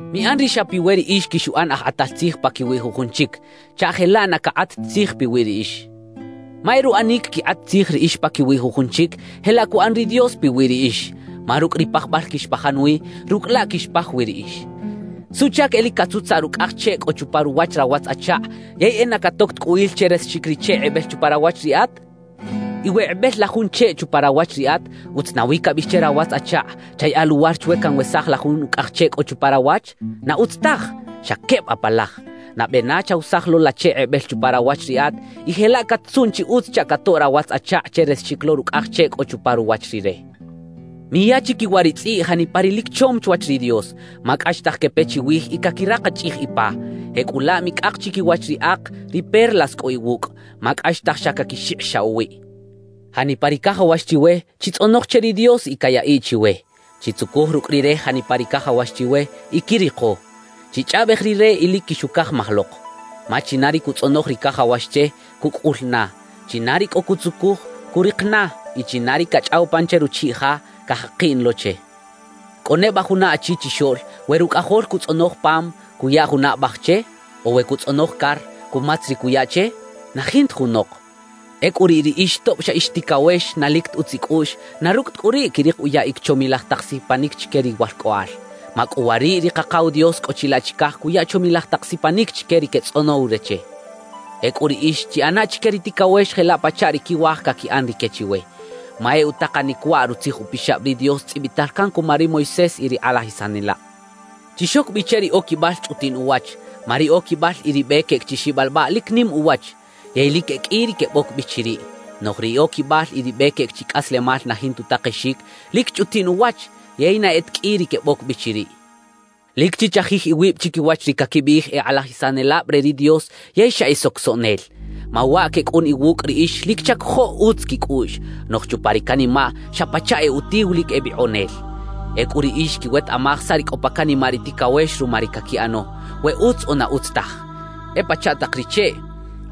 »Miꞌan ri xa piwe riꞌix quixuꞌan aj kꞌatal tzij paquiwi jujun chic, chaꞌ jelaꞌ na cakꞌat ta tzij piwi riꞌix. Ma e ruꞌanic quikꞌat tzij riꞌix paquiwi jujun chic, jelaꞌ cuꞌan ri Dios piwi riꞌix; ma rucꞌ ri pajbal quixpajan wi, rucꞌ laꞌ quixpaj wi riꞌix. »¿Suꞌchac e lic catzutzaꞌ rucꞌaj cheꞌ cꞌo chupa ruwach rawatz-achakꞌ yey e na catoc ta cꞌu il che resaxic ri cheꞌ kꞌebel chupa rawach riꞌat? Y we kꞌebel la jun cheꞌ chupa rawach riꞌat, ¿utz nawi cabiꞌij che rawatz-achakꞌ: “Chayaꞌa luwar chwe canwesaj la jun ucꞌaj cheꞌ cꞌo chupa rawach”? ¡Na utz taj! ¡Xa queb apalaj! Nabe na chawesaj lo la cheꞌ kꞌebel chupa rawach riꞌat, y jelaꞌ cat-tzuꞌn chi utz chaꞌ catoꞌ rawatz-achakꞌ che resaxic lo rucꞌaj cheꞌ cꞌo chupa ruwach rire. »Miya chiquiwa ri tzꞌiꞌ janipa ri lic chom chwach ri Dios, ma cꞌaxtaj quepe chiwij y caquirakachꞌij ipa; jecꞌulaꞌ micꞌak chiquiwach ri ak ri perlas cꞌo iwucꞌ, ma cꞌaxtaj xa caquixikꞌixaꞌ uwiꞌ. »Janipa ri cajawax chiwe, chitzꞌonoj che ri Dios y cayaꞌiꞌ chiwe; chitzucuj rucꞌ Rire janipa ri cajawax chiwe y quiriko; chichꞌaꞌbej Rire y lic quixucajmaj lok. Ma china ri cutzꞌonoj ri cajawax che, cucꞌul na; china ri cꞌo cutzucuj, curik na; y china ri cachꞌaw pan che ruchiꞌ ja, cajakiꞌ na lo che. »¿Cꞌo neba juna achi chixoꞌl, we rucꞌajol cutzꞌonoj pam, cuya juna abaj che; o we cutzꞌonoj car, cumatz ri cuya che? ¡Na jintaj junok! Ecꞌu riꞌ riꞌix tob xa ix ticawex na lic ta utz icꞌuꞌx, na rucꞌ ta cꞌu riꞌ, quirik uyaꞌic chomilaj tak sipanic chique riwalcꞌoꞌal. ¡Macꞌuwariꞌ ri Kakaw Dios cꞌo chilaꞌ chicaj cuya chomilaj tak sipanic chique ri quetzꞌonow re che! »Ecꞌu riꞌix chiꞌana chique ri ticawex jelaꞌ pachaꞌ ri quiwaj caquiꞌan rique chiwe. Ma e utakanic waꞌ Rutzij Upixab ri Dios tzꞌibital can cuma ri Moisés y ri kꞌalajisanelab. »Chixoc bi che ri oquibal chꞌutiꞌn uwach. Ma ri oquibal y ri be queꞌec chi xibalbaꞌ lic nim uwach, yey lic e qꞌui ri queboc bi chiriꞌ. Noꞌj ri oquibal y ri be queꞌec chi cꞌaslemal na jinta utakexic, lic chꞌutiꞌn uwach, yey na e ta qꞌui ri queboc bi chiriꞌ. »Lic chichajij iwib chiquiwach ri caquibiꞌij e kꞌalajisanelab re ri Dios yey xa e socosoꞌnel. Ma waꞌ quecꞌun iwucꞌ riꞌix lic chacojoꞌ utz quicꞌuꞌx, noꞌj chupa ri canimaꞌ xa pachaꞌ e utiw lic e bikꞌonel. Ecꞌu riꞌix quiwetaꞌmaj saꞌ ri cꞌo pa canimaꞌ ri ticawex ruma ri caquiꞌano, we utz o na utz taj. »E pachaꞌ tak ri cheꞌ: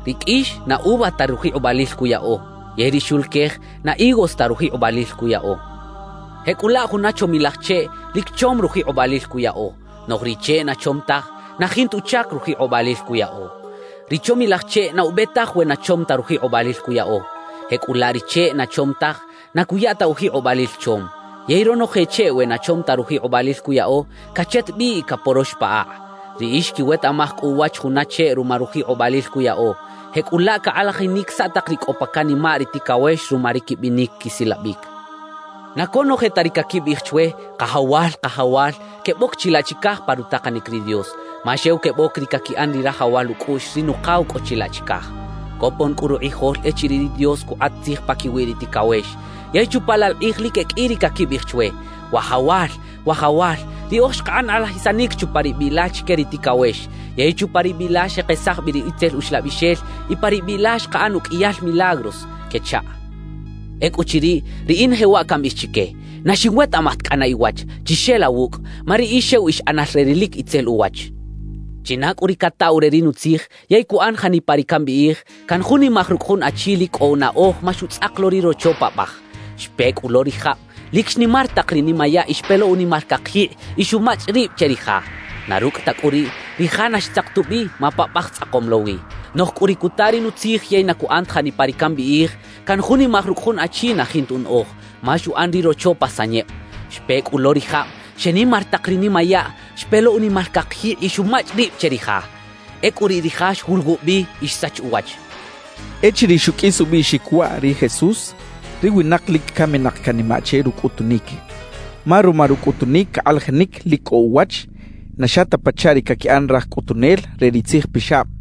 ri qꞌuix, na uva ta rujikꞌobalil cuyaꞌo; yey ri xuluquej, na higos ta rujikꞌobalil cuyaꞌo. Jecꞌulaꞌ juna chomilaj cheꞌ, lic chom rujikꞌobalil cuyaꞌo; noꞌj ri cheꞌ na chom taj, na jinta uchac rujikꞌobalil cuyaꞌo. Ri chomilaj cheꞌ na ube taj we na chom ta rujikꞌobalil cuyaꞌo; jecꞌulaꞌ ri cheꞌ na chom taj na cuya ta ujikꞌobalil chom. Yey ronoje cheꞌ we na chom taj rujikꞌobalil cuyaꞌo, cachet bi y caporox pa akꞌ. Riꞌix quiwetaꞌmaj cꞌu uwach juna cheꞌ ruma rujikꞌobalil cuyaꞌo; jecꞌulaꞌ cakꞌalajinic saꞌ tak ri cꞌo pa canimaꞌ ri ticawex ruma ri quibinic quisilabic. »Na conoje ta ri caquibiꞌij chwe “Kajawal, Kajawal” queboc chilaꞌ chicaj pa rutakanic ri Dios, ma xew queboc ri caquiꞌan ri rajawal ucꞌuꞌx ri Nukaw cꞌo chilaꞌ chicaj. Copon cꞌu rukꞌijol echiriꞌ ri Dios cukꞌat tzij paquiwi ri ticawex, yey chupa laꞌ la kꞌij lic e qꞌui ri caquibiꞌij chwe: “Wajawal, Wajawal, riꞌoj xkaꞌan kꞌalajisanic chupa ri biꞌ la chique ri ticawex. Yey chupa ri biꞌ la xekesaj bi ri itzel uxlabixel y pa ri biꞌ la xkaꞌan uqꞌuiyal milagros” quechaꞌ. Ecꞌuchiriꞌ, riꞌin jewaꞌ cambiꞌij chique: “Na xinwetaꞌmaj ta cꞌana iwach, chixela wucꞌ; ma riꞌix xew ix ꞌanal re ri lic itzel uwach.” »China cꞌu ri cataw re ri nutzij yey cuꞌan janipa ri cambiꞌij, canjunimaj rucꞌ jun achi lic cꞌo unaꞌoj ma xutzꞌak lo ri rocho paꞌbaj. Xpe cꞌu lo ri jab, lic xnimar tak ri nimayaꞌ y xpe lo unimal cakjikꞌ y xumachꞌ rib che ri ja; na rucꞌ ta cꞌu riꞌ, ri ja na xtzak ta ubi, ma paꞌbaj tzꞌakom lo wi. Noꞌj cꞌu ri cuta ri nutzij yey na cuꞌan ta janipa ri cambiꞌij, canjunimaj rucꞌ jun achi na jinta unaꞌoj, ma xuꞌan ri rocho pa sanyeb. Xpe cꞌu lo ri jab, xenimar tak ri nimayaꞌ, xpe lo unimal cakjikꞌ y xumachꞌ rib che ri ja. Ecꞌu riꞌ ri ja xwuluwub bi y xsach uwach» xchaꞌ. Echiriꞌ xuqꞌuis ubiꞌxic waꞌ ri Jesús, ri winak lic caminak canimaꞌ che rucꞌutunic, ma ruma rucꞌutunic cakꞌalajinic lic cꞌo uwach, na xa ta pachaꞌ ri caquiꞌan raj cꞌutunel re ri tzijpixab.